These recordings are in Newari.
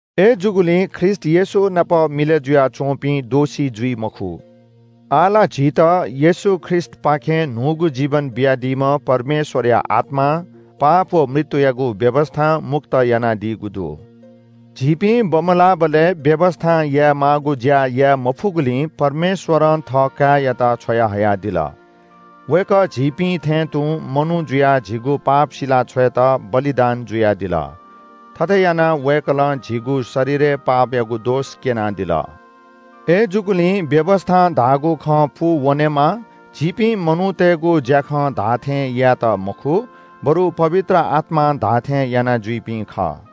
अय्‌जूगुलिं ख्रीष्‍ट येशू नाप मिलय् जुयाच्‍वंपिं दोषी जुइ मखु। आः ला झीत येशू ख्रीष्‍टपाखें न्‍हूगु जीवन बियादीम्‍ह परमेश्‍वरया आत्‍मां पाप व मृत्‍युयागु व्‍यवस्‍थां मुक्त यानादीगु दु। झीपिं बमलाःबलय् व्‍यवस्‍थां यायेमाःगु ज्‍या याये मफुगुलिं परमेश्‍वरं थःकाय्‌यात छ्वयाहयादिल। वय्‌कः झीपिं थें तुं मनू जुयाः झीगु पाप सिला छ्वयेत बलिदान जुयादिल। थथे यानाः वय्‌कलं झीगु शरीरय् पापयागु दोष क्‍यनादिल। अय्‌जूगुलिं व्‍यवस्‍थां धाःगु खँ पूवनेमा झीपिं मनूतय्‌गु ज्‍याखं धाःथें यायेत मखु, बरु पवित्र आत्‍मां धाःथें यानाजुइपिं खः।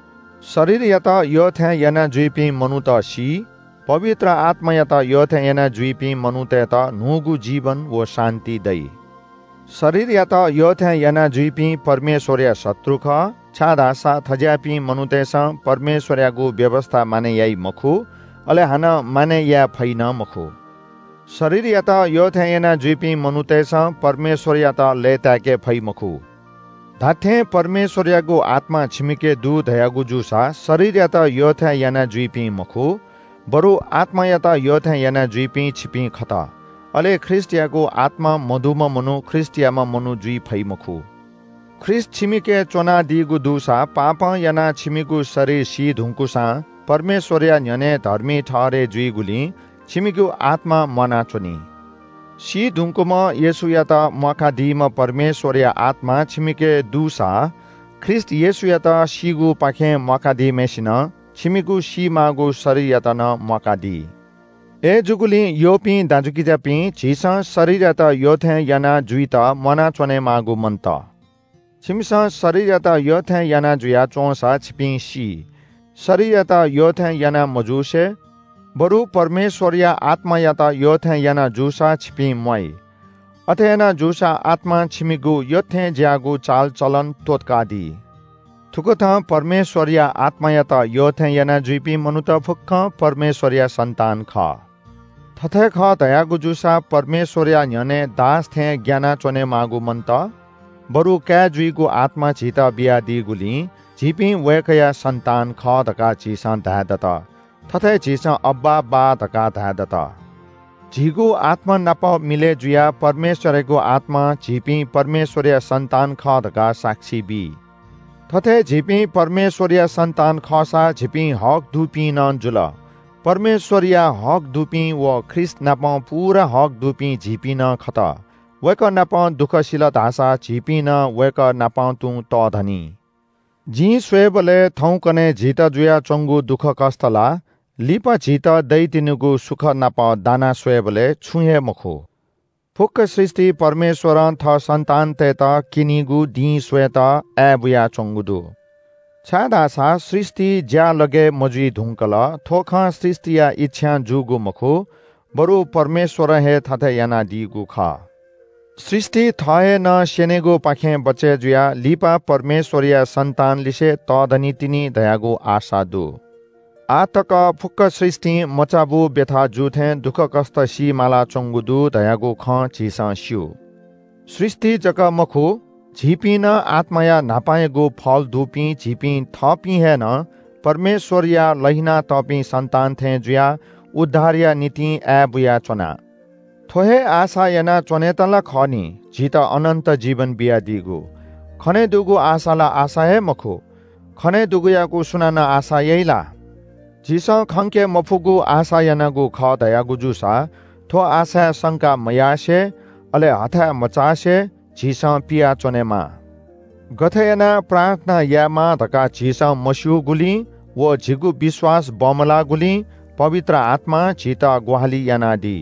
शरीरयात यःथें यानाजुइपिं मनूत सी। पवित्र आत्‍मायात यःथें यानाजुइपिं मनूतय्‌त न्‍हूगु जीवन व शान्‍ति दइ। शरीरयात यःथें यानाजुइपिं परमेश्‍वरया शत्रु खः, छाय्‌धाःसा थज्‍याःपिं मनूतय्‌सं परमेश्‍वरयागु व्‍यवस्‍था मानय् याइ मखु, अले हानं मानय् याये फइ नं मखु। शरीरयात यःथें यानाजुइपिं मनूतय्‌सं परमेश्‍वरयात लय्‌ताय्‌के फइ मखु। धात्‍थें परमेश्‍वरयागु आत्‍मा छिमिके दु धयागु जूसा शरीरयात यःथें यानाजुइपिं मखु, बरु आत्‍मायात यःथें यानाजुइपिं छिपिं खत, अले ख्रीष्‍टयागु आत्‍मा मदुम्‍ह मनू ख्रीष्‍टयाम्‍ह मनू जुइ फइ मखु। ख्रीष्‍ट छिमिके च्‍वनादीगु दुसा पापं यानाः छिमिगु शरीर सी धुंकूसां परमेश्‍वरया न्‍ह्यःने धर्मी ठहरय् जूगुलिं छिमिगु आत्‍मा म्‍वानाच्‍वनी। सी धुंकूम्‍ह येशूयात म्‍वाकादीम्‍ह परमेश्‍वरया आत्‍मा छिमिके दुसा ख्रीष्‍ट येशूयात सीगुपाखें म्‍वाकादीम्‍हय्‌सिनं छिमिगु सीमाःगु शरीरयात नं म्‍वाकादी। अय्‌जूगुलिं यःपिं दाजुकिजापिं, झीसं शरीरयात यःथें याना जुइत म्‍वाना च्‍वनेमाःगु मन्‍त। छिमिसं शरीरयात यःथें याना जुया च्‍वंसा छिपिं सी। शरीरयात यःथें याना मजुसे बरु परमेश्‍वरया आत्‍मायात यःथें याना जूसा छिपिं म्‍वाइ। अथे याना जूसा आत्‍मां छिमिगु यत्‍थेंज्‍याःगु चालचलन त्‍वःतकादी। थुकथं परमेश्‍वरया आत्‍मायात यःथें यानाजुइपिं मनूत फुक्‍कं परमेश्‍वरया सन्‍तान खः। थथे खः धयागु जूसा परमेश्‍वरया न्‍ह्यःने दास थें ग्‍याना च्‍वनेमाःगु मन्‍त, बरु काय् जुइगु आत्‍मा झीत बियादीगुलिं झीपिं वय्‌कःया सन्‍तान खः धकाः झीसं धाये दत। थथे झीसं “अब्‍बा, बाः” धकाः धाये दत। झीगु आत्‍मानाप मिलय् जुयाः परमेश्‍वरयागु आत्‍मां झीपिं परमेश्‍वरया सन्‍तान खः धकाः साक्षी बी। थथे झीपिं परमेश्‍वरया सन्‍तान खःसा झीपिं हक दुपिं नं जुल। परमेश्‍वरया हक दुपिं व ख्रीष्‍टनापं पूरा हक दुपिं झीपिं नं खत। वय्‌कः नाप दुःख सिल धाःसा झीपिं नं वय्‌कःनापं तुं तःधनी। जिं स्‍वय्‌बलय् थौंकन्‍हय् झीत जुयाच्‍वंगु दुःखकष्‍ट ला लिपा झीत दइ तिनिगु सुख नाप दाना स्‍वयेबलय् छुं हे मखु। फुक्‍क सृष्‍टि परमेश्‍वरं थः सन्‍तानतय्‌त क्‍यनेगु दिं स्‍वयेत आय्‌बुया च्‍वंगु दु। छाय्‌धाःसा सृष्‍टि ज्‍यालगय् मजुइ धुंकल। थ्‍व खँ सृष्‍टिया इच्‍छां जूगु मखु, बरु परमेश्‍वरं हे थथे यानादीगु खः। सृष्‍टि थः हे नं स्‍यनेगुपाखें बचय् जुयाः लिपा परमेश्‍वरया सन्‍तानलिसें तःधनी तिनि धयागु आशा दु। आः तक फुक्‍क सृष्‍टिं मचाबू ब्‍यथा जू थें दुःखकष्‍ट सी मालाच्‍वंगु दु धयागु खँ झीसं स्‍यू। सृष्‍टि जक मखु, झीपिं नं आत्‍माया न्‍हापांयागु फल दुपिं झीपिं थःपिं हे नं परमेश्‍वरया लहिनातःपिं सन्‍तान थें जुयाः उद्धारया निंतिं आय्‌बुयाच्‍वना। थ्‍व हे आशा यानाच्‍वनेत ला खः नि, झीत अनन्‍त जीवन बियादीगु। खनेदुगु आशा ला आशा हे मखु। खने दुगुयागु सुनानं आशा याइ ला? झीसं खंके मफुगु आशा यानागु खः धयागु जूसा थ्‍व आशाय् संका मयासें, अले हथाय् मचासे झीसं पियाच्‍वनेमाः। गथे यानाः प्रार्थना यायेमाः धकाः झीसं मस्‍यूगुलिं व झीगु विश्‍वास बमलाःगुलिं पवित्र आत्‍मां झीत ग्‍वाहालि यानादी।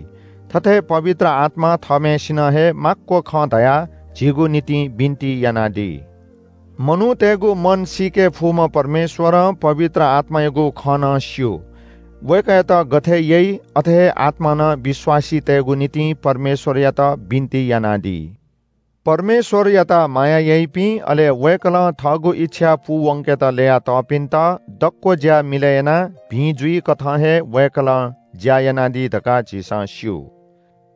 थथे पवित्र आत्‍मा थःम्‍हय्‌सिनं हे माक्‍व खँ धयाः झीगु निंतिं बिन्‍ति यानादी। मनूतय्‌गु मन सीके फुम्‍ह परमेश्‍वरं पवित्र आत्‍मायागु खँ नं स्‍यू। वय्‌कःयात गथे यइ अथे आत्‍मां नं विश्‍वासीतय्‌गु निंतिं परमेश्‍वरयात बिन्‍ति यानादी। परमेश्‍वरयात माया याइपिं, अले वय्‌कलं थःगु इच्‍छा पूवंकेत ल्‍ययातःपिन्‍त दक्‍व ज्‍या मिलय् यानाः भिं जुइकथं हे वय्‌कलं ज्‍या यानादी धकाः झीसं स्‍यू।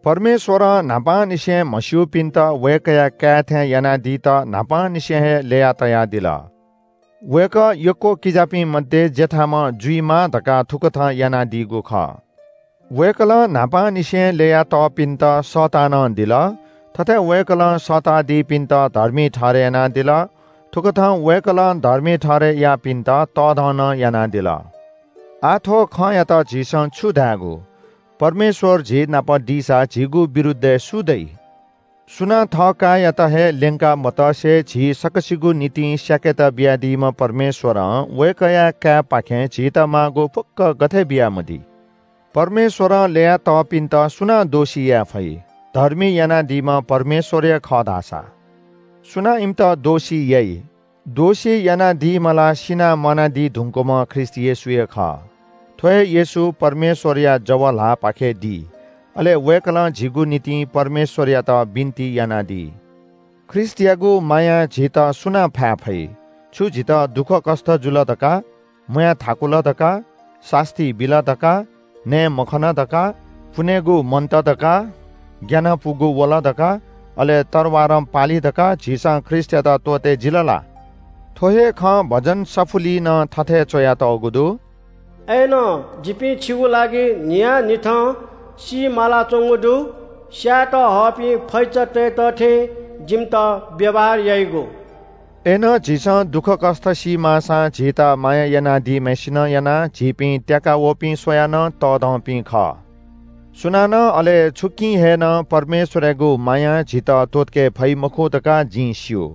परमेश्‍वरं न्‍हापांनिसें म्‍हस्‍यूपिन्‍त वय्‌कःया काय् थें यानादीत न्‍हापांनिसें हे ल्‍यया तयादिल। वय्‌कः यक्‍व किजापिं मध्‍ये जेठाम्‍ह जुइमा धकाः थुकथं यानादीगु खः। वय्‌कलं न्‍हापांनिसें ल्‍ययातःपिन्‍त सःता नं दिल। थथे वय्‌कलं सःतादीपिन्‍त धर्मी ठहरय् यानादिल। थुकथं वय्‌कलं धर्मी ठहरय् याःपिन्‍त तःधं नं यानादिल। आः थ्‍व खँयात झीसं छु धायेगु? परमेश्‍वर झीनाप दीसा झीनाप ल्‍वाइपिं सु? सुनां थःकाय्‌यात हे ल्‍यंका मतसे झी सकसिगु निंतिं स्‍याकेत बियादीम्‍ह परमेश्‍वरं वय्‌कःया काय्‌पाखें झीत माःगु फुक्‍कं गथे बियामदी? परमेश्‍वरं ल्‍ययातःपिन्‍त सुनां दोषी याये फइ? धर्मी यानादीम्‍ह परमेश्‍वर हे खः धाःसा सुनां इमित दोषी याइ? दोषी यानादीम्‍ह ला सिनाः म्‍वानादी धुंकूम्‍ह ख्रीष्‍ट येशू हे खः। थ्‍व हे येशू परमेश्‍वरया जव ल्‍हाःपाखे दी। अले वय्‌कलं झीगु निंतिं परमेश्‍वरयात बिन्‍ति यानादी। ख्रीष्‍टयागु मायां झीत सुनां फाये फइ? छु झीत दुःखकष्‍ट जुल धकाः, म्‍वाय् थाकुल धकाः, सास्‍ती बिल धकाः, नये मखन धकाः, पुनेगु मन्‍त धकाः, ग्‍यानपुगु वल धकाः, अले तरवारं पाली धकाः झीसं ख्रीष्‍टयात त्‍वःते जिल ला? थ्‍व हे खँ भजन सफुलिइ नं थथे च्‍वयातःगु दु – “अय्‌नं जिपिं छिगु लागि न्‍हियान्‍हिथं सी मालाच्‍वंगु दु। स्‍यायेत हःपिं फैचातय्‌त थें जिमित व्‍यवहार याइगु।” अय्‌नं झीसं दुःखकष्‍ट सी माःसां झीत माया यानादीम्‍हय्‌सिनं यानाः झीपिं त्‍याका वःपिं स्‍वयाः नं तःधंपिं खः। सुनानं अले छुकिं हे नं परमेश्‍वरयागु मायां झीत त्‍वःतके फइ मखु धकाः जिं स्‍यू।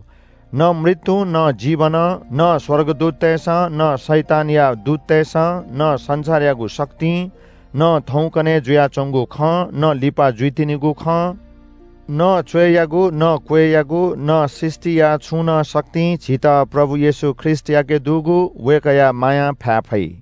न मृत्‍युं, न जीवनं, न स्‍वर्गदूततय्‌सं, न शैतानया दूततय्‌सं, न संसारयागु शक्तिं, न थौंकन्‍हय् जुयाच्‍वंगु खं, न लिपा जुइतिनिगु खं, न च्‍वय्‌यागु, न क्‍वय्‌यागु, न सृष्‍टिया छुं नं शक्तिं झीत प्रभु येशू ख्रीष्‍टयाके दुगु वय्‌कःया मायां फाये फइ।